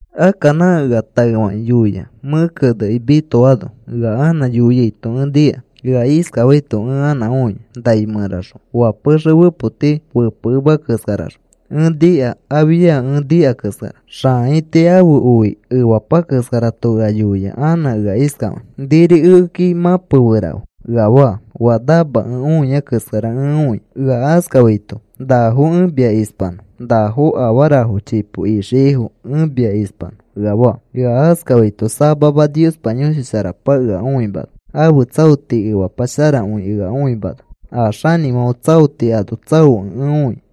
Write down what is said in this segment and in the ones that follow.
Akka nã ea taefakĩ yoia, mẽ kenekĩ mitoano, ea anã yoiaito ẽ nika. Ea iskafaito ẽ anã õia nai mẽraxõ oa pexe fepoti fepekemea keskaraxõ. Ẽ nika afia ẽ nika keskara xãaiti ãfe oi efapa keskarato ea yoia anã ea iskafakĩ: “Niri ekeki mãpeferafe,” ea faa. Oa namakẽ õia keskara ẽ õia ea iskafaito: “Nafo ẽ mia ispanõ nafo afarafo chipo ixiaifo ẽ mia ispanõ,” ea faa. Ea askafaito samama Niospa Yõshi Sharapa ea õimana ãfe tsaoti efapa sharakõi ea õimana a xanĩfãfe tsaoti ano tsaokẽ ẽ õia.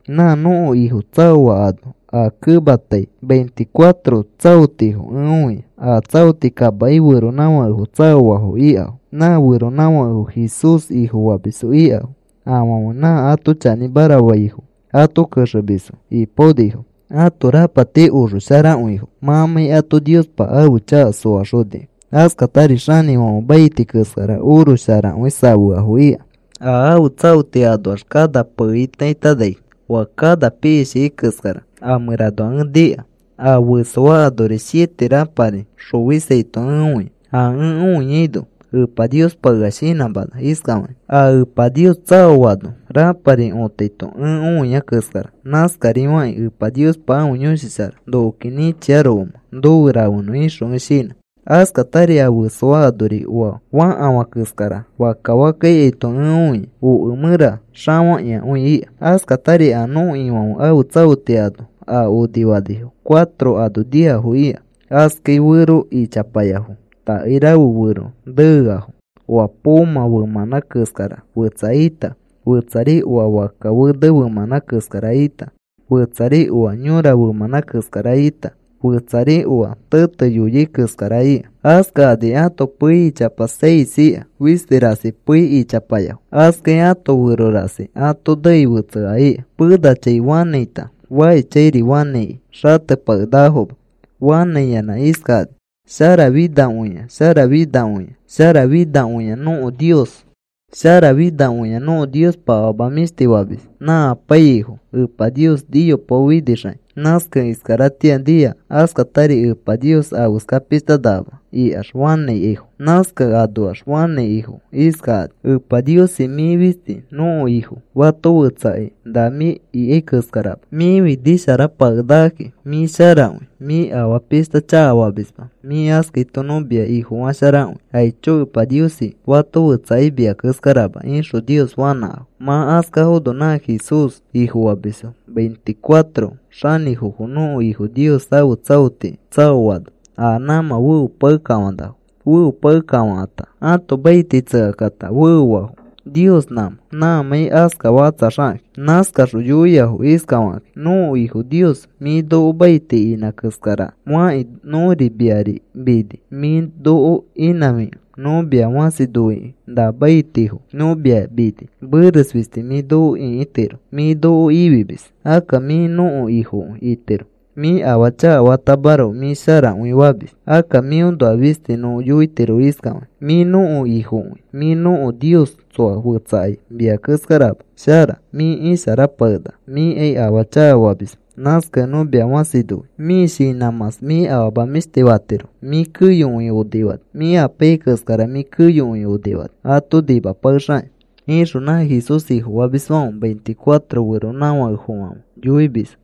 Nã nõko Ifo tsaoa ano a kematai veinticuatro tsaotifo ẽ õia. A tsaoti kamaki feronãfakefo tsaoafo ikafo. Nã feronãfakefo Jesús Ifofamisfo ikafo. Afãfe nã ato chanĩmara faifo ato kexemisfo ipaonifo. Ãto rapati oxo sharakõifo mãmãi ato Niospa ãfe chaka soaxonikẽ. Askatari xanĩfãfe maiti keskara oro sharakõi safeafo ika. A ãfe tsaoti anoax kana peeitaitani oa kana piishikai keskara a mẽranoa ẽ nika. A fesoa anori siete rãpari xofisaito ẽ õia. A ẽ õiaino Epa Niospa ea shinãmana iskafakĩ: “A Epa Nios tsaoano rãpari otaito ẽ õia keskara, nãskarifakĩ Epa Niospa ãfe Yõshi Shara nokoki nĩchiarokomẽ nofe rafenõ,” ixõ ẽ shinã. Askatari a fesoa anori oa fakafã keskara fakka fakka ikaito ẽ õia, oke mẽra xafakĩakõi ika. Askatari a nõko Ifãfe ãfe tsaoti ano a onifanifo cuatro ano niafo ika. Askai fero ichapayafo. Takairafe fero neeafo. Oa poomã femãnã keskara fetsa ita, fetsari oa fakka fene femãnã keskara ita, fetsari oa yõra femãnã keskara ita, fetsari oa tete yoyai keskara ika. Askakani ãto pei ichapa seis ika, fisti rasi pei ichapayafo. Askai ãto fero rasi ato neei fetsea ika. Penachãi fanãita, fakishchãiri fanãiki xatepakenakafoma. Fanãiyanã iskafakani: Sharafinakõia, sharafinakõia, sharafinakõia, nõko Nios sharafinakõi. Nõko Niospa afama mĩshti famis nã apaiyaifo. Epa Nios niyopaofinixakĩ, nãskakẽ iskaratĩa nia. Askatari Epa Nios afeska pishta nakama, ikax fanãikaifo. Nãskakẽ aõnoax fanãikafo iskakani: “Epa Niosi, mĩ fisti nõko Ifo. Fato fetsakai na mĩ ikai keskarama. Mĩfi nĩsharapakenakaki. Mĩ sharakõi. Mĩ afaa pishta chakafamisma. Mĩ askaito nõ mia Ifofasharakõi. Aicho Epa Niosi. Fato fetsakai mia keskarama,” ixõ Nios fanãkafo. Mã askafono nã Jesús Ifofamisfo veinticuatro xanĩfofo nõko Ifo Nios ãfe tsaotiki tsaoano a nãmã feopakefofãnafo. Feopakefofãkata, ãto maiti tsekakata feofafo Nios nãmã mãmãi askafakatsaxakakĩ. Nãskaxõ yoiafo iskafakakĩ: “Nõko Ifo Nios mĩ noko maiti inã keskari fakĩ nõri miari mini. Mĩ noko inãfikẽ nõ mia fãsi noikĩ na maitifo nõ mia mini. Meres fisti mĩ noko ĩkitiro. Mĩ noko ifimis. Akka mĩ nõko Ifokõi itiro. Mĩ afaa chakafatamaroko mĩ sharakõifamis. Akka mĩõnoa fisti nõ yoitiro iskafakĩ: Mĩ nõko Ifokõi. Mĩ nõko Nios. Tsoa fetsakai mia keskarama shara. Mĩ isharapakenaka. Mĩkai afaa chakafamisma. Nãskakẽ nõ mia fãsi noi. Mĩ shinãmãs mĩ afama mĩshti fatiro. Mĩ keyokõi onifani. Mĩ apaiyai keskara mĩ keyokõi onifani ato nimapakexakĩ,” ixõ nã Jesús Ifofamisfãfe veinticuatro xanĩfofofãfe yoimisfo.